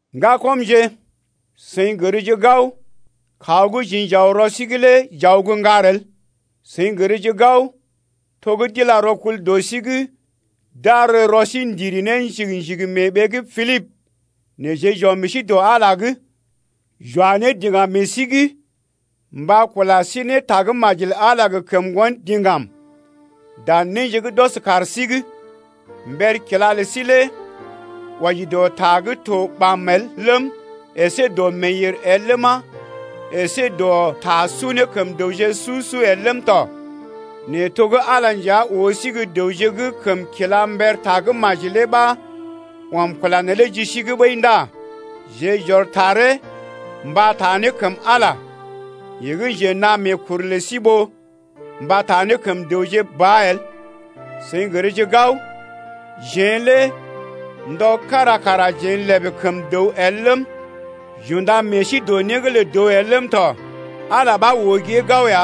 Ŋgakɔmje, seḭ gərje gao, kaw gə́ jeḛ j’aw rɔ sí’g lé j’aw gə́ ŋgar el. Seḭ gərje gao, to gə́ d’ila rɔkul dɔ sí’g d’ar rɔ sí ndiri ne njigi-njigi mee ɓee gə́ Pilibə nɛ jeḛ j’ɔm meḛ sí dɔ Ala’g, j’wa ne diŋgam meḛ sí’g mba kula sí ne tagə́maji lə Ala gə kəm ŋgon diŋgam dan néje gə́ d’ɔs kaar sí’g. Mber kila lə sí lé wɔji dɔ ta gə́ to ɓam el ləm, əsé dɔ meeyèr el ləma, əsé dɔ ta su ne kəm dəwje su-su el ləm tɔ. Nɛ to gə́ Ala nja oo sí gə́ dəwje gə́ kəm kila mber Tagə́maji lé ɓa ɔm kula neelé ji sí’g ɓəi ndá jeḛ j’ɔr taree mba n’taa ne kəm Ala ya, yeḛ gə́ njenaa meekuru lə sí ɓó mba taa ne kəm dəwje ba el. Seḭ gərje gao, jeḛ lé ndɔ kára kara jeḛ lèbè kəm dəw el ləm, j’unda meḛ sí dɔ né’g lə dəw el ləm tɔ. Ala ɓa oo gée gao ya.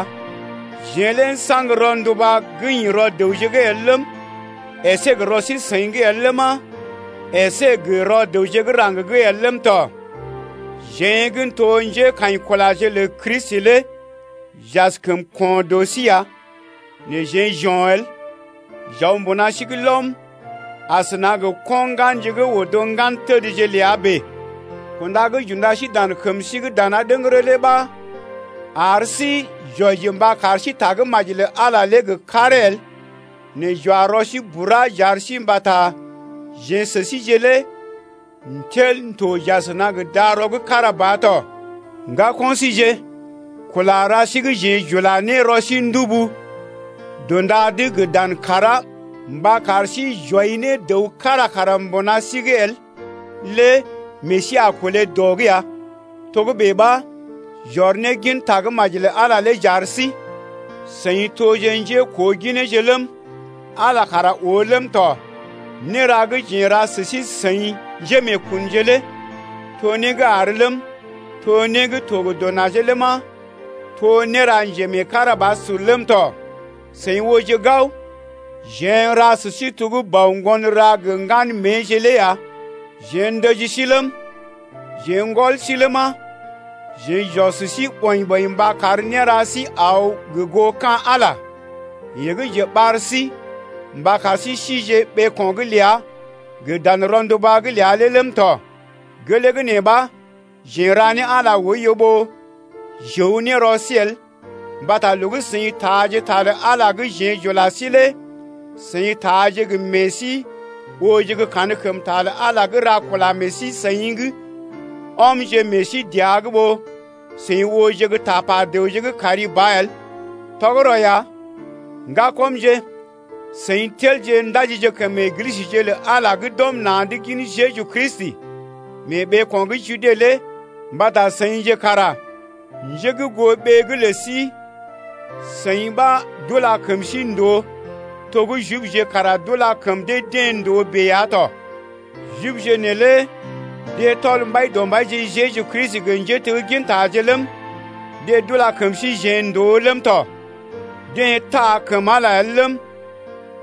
Jeḛ lé n’saŋg rɔnduba gə́ ḭ rɔ dəwje’g el ləm, əsé gə rɔ sí-seḭ’g el ləma, əsé gə rɔ dəwje gə́ raŋg’g el ləm tɔ. Jeḛ gə́ n’to njékaḭkulaje lə Kristi lé j’askəm ko̰ dɔ sí ya nɛ jeḛ j’o̰ el. J’aw mbuna sí’g lɔm asəna gə ko̰ ŋganje gə́ odo ŋgantədje ləa bèe. Kunda gə́ j’unda sí dan kəm sí’g dana ɗəŋgərə lé ɓa ar sí j’wɔji mba kar sí Tagə́maji lə Ala lé gə karee el nɛ j’wa rɔ sí bura j’ar sí mbata jeḛ sə síje lé n’tel n’to j’asəna gə darɔ gə́ kára ba tɔ. Ŋgako̰ síje, kula ra sí gə́ jeḛ j’ula ne rɔ sí ndubu dṵda’d gə dan kàrá mba kar sí j’wɔi ne dəw kára kara mbuna sí’g el lé meḛ sí a kolé dɔ’g ya, togə́bè ɓa, j’ɔr ne gin Tagə́maji lə Ala lé j’ar sí. Seḭ toje njékoogineje ləm, Ala kara oo ləm tɔ. Néra gə́ jeḛ n’ra sə sí-seḭ njémeekunje lé to né gə́ àr ləm, to né gə́ to gə dɔ najee ləma, to néra njemeekarabasur ləm tɔ. Seḭ ooje gao, jeḛ n’ra sə sí to gə́ bɔ ŋgon ra gə ŋgan méeje lé ya. Jeḛ ndəji sí ləm, jeḛ n’gɔl sí ləma, jeḛ j’ɔs sí ɓɔḭ-ɓɔḭ mba kar néra sí aw gə goo ka̰ Ala, yeḛ gə́ njeɓar sí mba kar sí sije ɓeeko̰’g ləa gə dan rɔnduba’g ləa lé ləm tɔ. Gelee gə́ nee ɓa, jeḛ n’ra ne Ala oiyo ɓó j’əw ne rɔ sí el mbata loo gə́ seḭ taaje ta lə Ala gə́ jeḛ j’ula sí lé seḭ taaje gə meḛ sí, ooje gə́ kankəmta lə Ala gə́ ra kula meḛ sí-seḭ gə́ ɔmje meḛ sí dəa’g ɓó seḭ ooje gə́ tapa dəwje gə́ kari ba el. Tɔgərɔ ya, ŋgakɔmje, seḭ telje ndajije kəm Eglisəje lə Ala gə́ d’ɔm na̰’d gin Jeju Kristi mee ɓeeko̰ gə́ Jude lé mbata seḭje kara njé gə́ goo ɓee’g lə sí-seḭ ɓa d’ula kəm sí ndòo to gə́ Jibje kara d’ula kəm dee-deḛ ndòo bèe ya tɔ. Jibje neelé deḛ tɔl Mbaidɔmbaije Jeju Kristi gə njéteggintaje ləm, deḛ d’ula kəm síjeḛ ndòo ləm tɔ. Deḛ taa kəm Ala el ləm,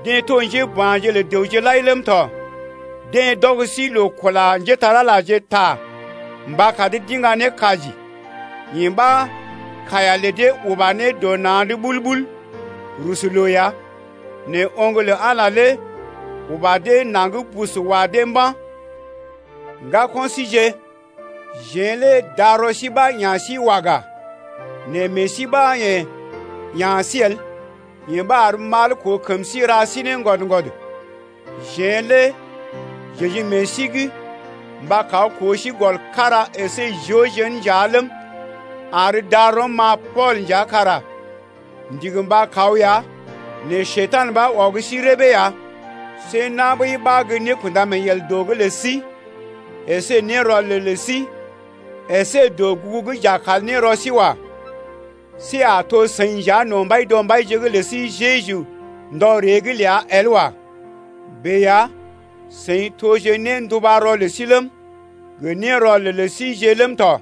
deḛ to njéba̰je lə dəwje lai ləm tɔ. Deḛ d’ɔg sí loo kula njépole-magəje ta mba kar dee d’iŋga ne kaji, yee ɓa kaiya lə dee uba ne dɔ na̰ ɓul-ɓul rusu loo ya. Nɛ oŋg lə Ala lé uba dee naŋg bus wa dee mba̰. Ŋgako̰ síje, jeḛ lé darɔ sí ɓa ya̰ sí waga nɛ meḛ sí ɓa yḛ̀ ya̰ sí el, yee ɓa ar mal koo kəm sí ra sí ne ŋgwɔd-ŋgwɔd. Jeḛ lé j’ə̰ji meḛ sí’g mba kaw koo sí gɔl kára əsé joo jén nja ləm, ar darɔm-ma Pool nja kara m’ndigi mba kaw ya nɛ Njekurai ɓa ɔg sí rəbee ya. See na̰ ɓəi ɓa gə́ nékunda-mee-yel dɔ’g lə sí əsé nérɔlel lə sí əsé dɔgugu gə́ j’a kal ne rɔ sí wa. See a to seḭ nja no̰ Mbaidɔmbaije’g lə sí Jeju ndɔ ree’g ləa el wa. Bèe ya, seḭ toje néndubarɔ lə sí ləm, gə nérɔlel lə síjeḛ ləm tɔ.